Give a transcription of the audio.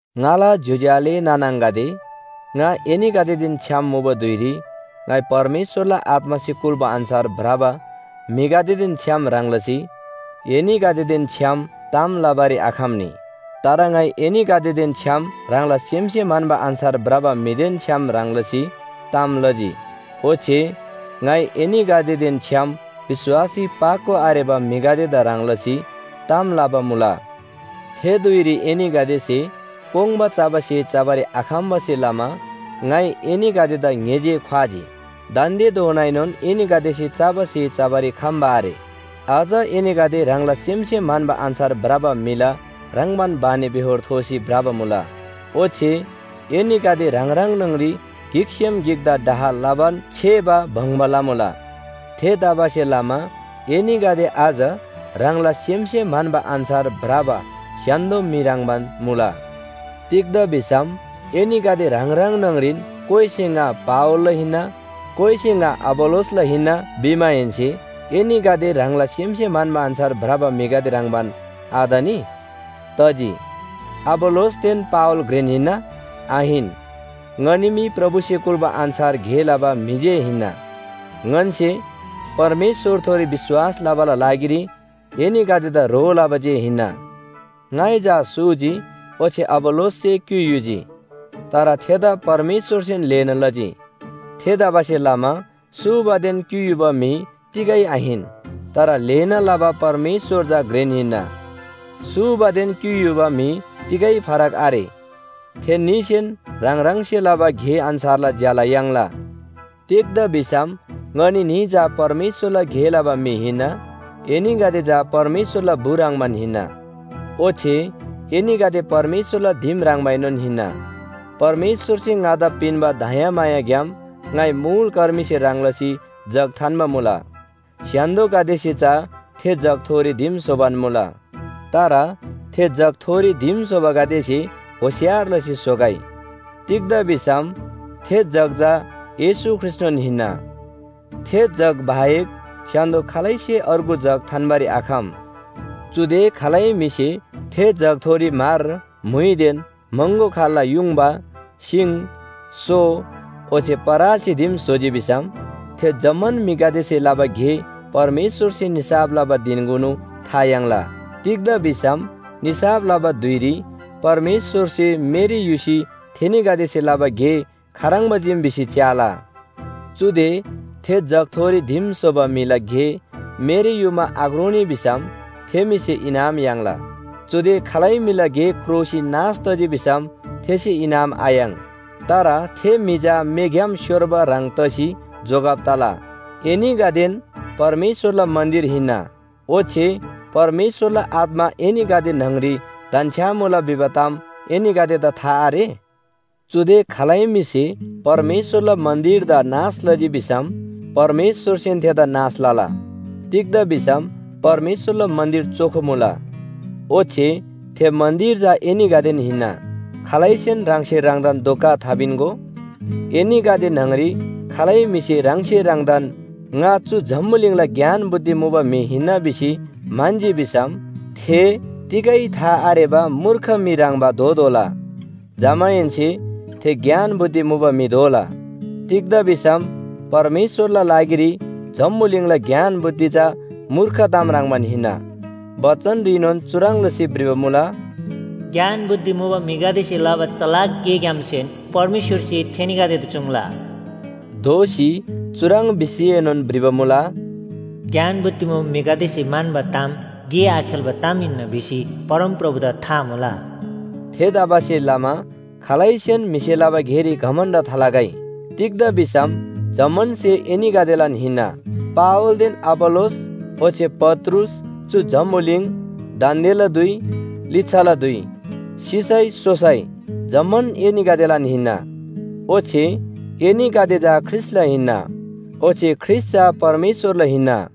ङाला ज्‍योज्‍यो आले नाना आङागदे, ङा एनीगदेदेन छ्‌याम मुबा धुइरी ङाइ परमेश्‍वरला आत्‍मासे कुल्‍बा अन्‍छार भ्रबा म्‍हिगदेदेन छ्‌याम ह्रङ् लसी एनीगदेदेन छ्‌याम ताम लबारी आखम्‍नी। तर ङाइ एनीगदेदेन छ्‌याम ह्राङला सेमसे म्‍हन्‍बा अन्‍छार भ्रबा म्‍हिदेन छ्‌याम ह्रङ् लसी ताम लजी। ओच्‍छे ङाइ एनीगदेदेन छ्‌याम विश्‍वासरी पाको आरेबा म्‍हिगदेदा ह्रङ् लसी ताम लबा मुला। थे धुइरी एनीगदेसे कोङ्बा चबा स्‍हे चबारी आखम्‍बासे लमा ङाइ एनीगदेदा ङ्‍हे जे ख्‍वाजी। दान्‍देधोनाएनोन एनीगदेसे चबा स्‍हे चबारी खम्‍बा आरे। अझ एनीगदे ह्राङला सेमसे म्‍हन्‍बा अन्‍छार भ्रबा म्‍हिला ह्रङ्‌बान बानीबेहोर थोसी भ्रबा मुला। ओच्‍छे एनीगदे ह्राङ ह्राङ न्‍हङरी गिकसेम गिकदा डाह लबान छेबा बङ्बा लमुला। थेतबासेलमा एनीगदे अझ ह्राङला सेमसे म्‍हन्‍बा अन्‍छार भ्रबा स्‍य्‍हान्‍दो म्‍हि ह्रङ्‌बान मुला। तिग्‍दा भिसम एनीगदे ह्राङ ह्राङ न्‍हङरीन कोइसे “ङा पावलला हिन्‍ना,” कोइसे “ङा अपोल्‍लोसला हिन्‍ना” भिमाहेन्‍से एनीगदे ह्राङला सेमसे म्‍हन्‍बा अन्‍छार भ्रबा म्‍हिगदे ह्रङ्‌बान आतनी? तजी। अपोल्‍लोसदेन पावल घ्रेन हिन्‍ना? आहिन। ङनी मी प्रभुसे कुल्‍बा अन्‍छार गे लबा म्‍हि जे हिन्‍ना। ङन्‍से परमेश्‍वरथोरी विश्‍वास लबाला लागिरी एनीगदेदा ह्रो लबा जे हिन्‍ना। ङाइ चा सूजी, ओच्‍छे अपोल्‍लोससे क्‍युइ युजी। तर थेदा परमेश्‍वरसेन ल्‍हेना लजी। थेतबासेलमा सूबादेन क्‍युइ युबा म्‍हि तिगै आहिन, तर ल्‍हेना लबा परमेश्‍वर चा घ्रेन हिन्‍ना। सूबादेन क्‍युइ युबा म्‍हि तिगै फरक आरे। थेन्‍नीसेन ह्राङ ह्राङसे लबा गे अन्‍छारला ज्‍याला याङ्ला। तिग्‍दा भिसम ङनी न्‍ही चा परमेश्‍वरला गे लबा म्‍हि हिन्‍ना, एनीगदे चा परमेश्‍वरला बु ह्रङ्‌बान हिन्‍ना। ओच्‍छे एनीगदे परमेश्‍वरला दिम ह्रङ्बाएनोन हिन्‍ना। परमेश्‍वरसे ङादा पिन्‍बा दयामायाग्‍याम ङाइ मुल कर्मीसे ह्रङ् लसी जग थान्‍बा मुला। स्‍य्‍हान्‍दोगदेसे चा थे जगथोरी दिम स्‍होबान मुला, तर थे जगथोरी दिम स्‍होबागदेसे होशियार लसी स्‍होगै। तिग्‍दा भिसम थे जग चा येशू ख्रीष्‍टनोन हिन्‍ना। थे जग बाहेक स्‍य्‍हान्‍दो खालैसे अर्गु जग थान्‍बारी आखम। चुदे खालै म्‍हिसे थे जगथोरी म्‍हर, म्‍हुइदेन महँगो खाल्‍ला युङबा, सिङ, सो ओच्‍छे परालसे दिम स्‍होजी भिसम, थे जम्‍मान म्‍हिगदेसे लबा गे परमेश्‍वरसे निसाफ लबा धिनकुनु था याङ्ला। तिग्‍दा भिसम निसाफ लबा धुइरी परमेश्‍वरसे मेरी युसी थेनीगदेसे लबा गे खाह्रङ्बा चीम भिसी च्‍याला। चुदे थे जगथोरी दिम स्‍होबा म्‍हिला गे मेरी युमा आक्रोनी भिसम थे म्‍हिसे इनाम याङ्ला। चुदे खालै म्‍हिला गे क्रोसी नाश तजी भिसम थेसे इनाम आयाङ्। तर थे म्‍हि चा मेग्‍याम स्‍योर्बा ह्रङ् तसी जोगब तला। एनीगदेन परमेश्‍वरला मन्‍दिर हिन्‍ना, ओच्‍छे परमेश्‍वरला आत्‍मा एनीगदे न्‍हङरी धन्‍छ्‌यामुला भिबा ताम एनीगदेदा था आरे? चुदे खालै म्‍हिसे परमेश्‍वरला मन्‍दिरदा नाश लजी भिसम परमेश्‍वरसेन थेदा नाश लला। तिग्‍दा भिसम परमेश्‍वरला मन्‍दिर चोखो मुला, ओच्‍छे थे मन्‍दिर चा एनीगदेन हिन्‍ना। खालैसेन ह्राङसे ह्राङदान धोका थापिन्‍गो। एनीगदे न्‍हङरी खालै म्‍हिसे ह्राङसे ह्राङदान ङा चु जम्‍बुलिङला ज्ञान बुद्धि मुबा म्‍हि हिन्‍ना भिसी म्‍हन्‍जी भिसम थे तिगै था आरेबा मूर्ख म्‍हि ह्रङ्‌बा दोतोःला। जमाहेन्‍से थे ज्ञान बुद्धि मुबा म्‍हि दोला। तिग्‍दा भिसम परमेश्‍वरला लागिरी जम्‍बुलिङला ज्ञान बुद्धि चा मूर्ख ताम ह्रङ्‌बान हिन्‍ना। बचनरीनोन चुह्रङ् लसी भ्रिबा मुला, “ज्ञान बुद्धि मुबा म्‍हिगदेसे लबा चलाक गेग्‍यामसेन परमेश्‍वरसे थेनीगदेदा चुङ्‌ला।” दोःसी चुह्रङ् भिसीएनोन भ्रिबा मुला, “ज्ञान बुद्धि मुबा म्‍हिगदेसे म्‍हन्‍बा ताम गे आखेल्‍बा ताम हिन्‍ना भिसी परमप्रभुदा था मुला।” थेतबासेलमा खालैसेन म्‍हिसे लबा गेरी घमण्‍ड थालगै। तिग्‍दा भिसम जम्‍मान स्‍हे एनीगदेलान हिन्‍ना, पावलदेन अपोल्‍लोस ओच्‍छे पत्रुस, चु जम्‍बुलिङ, दान्‍देला धुइ, लिच्‍छाला धुइ, सिसै सोसै जम्‍मान एनीगदेलान हिन्‍ना। ओच्‍छे एनीगदे चा ख्रीष्‍टला हिन्‍ना, ओच्‍छे ख्रीष्‍ट चा परमेश्‍वरला हिन्‍ना।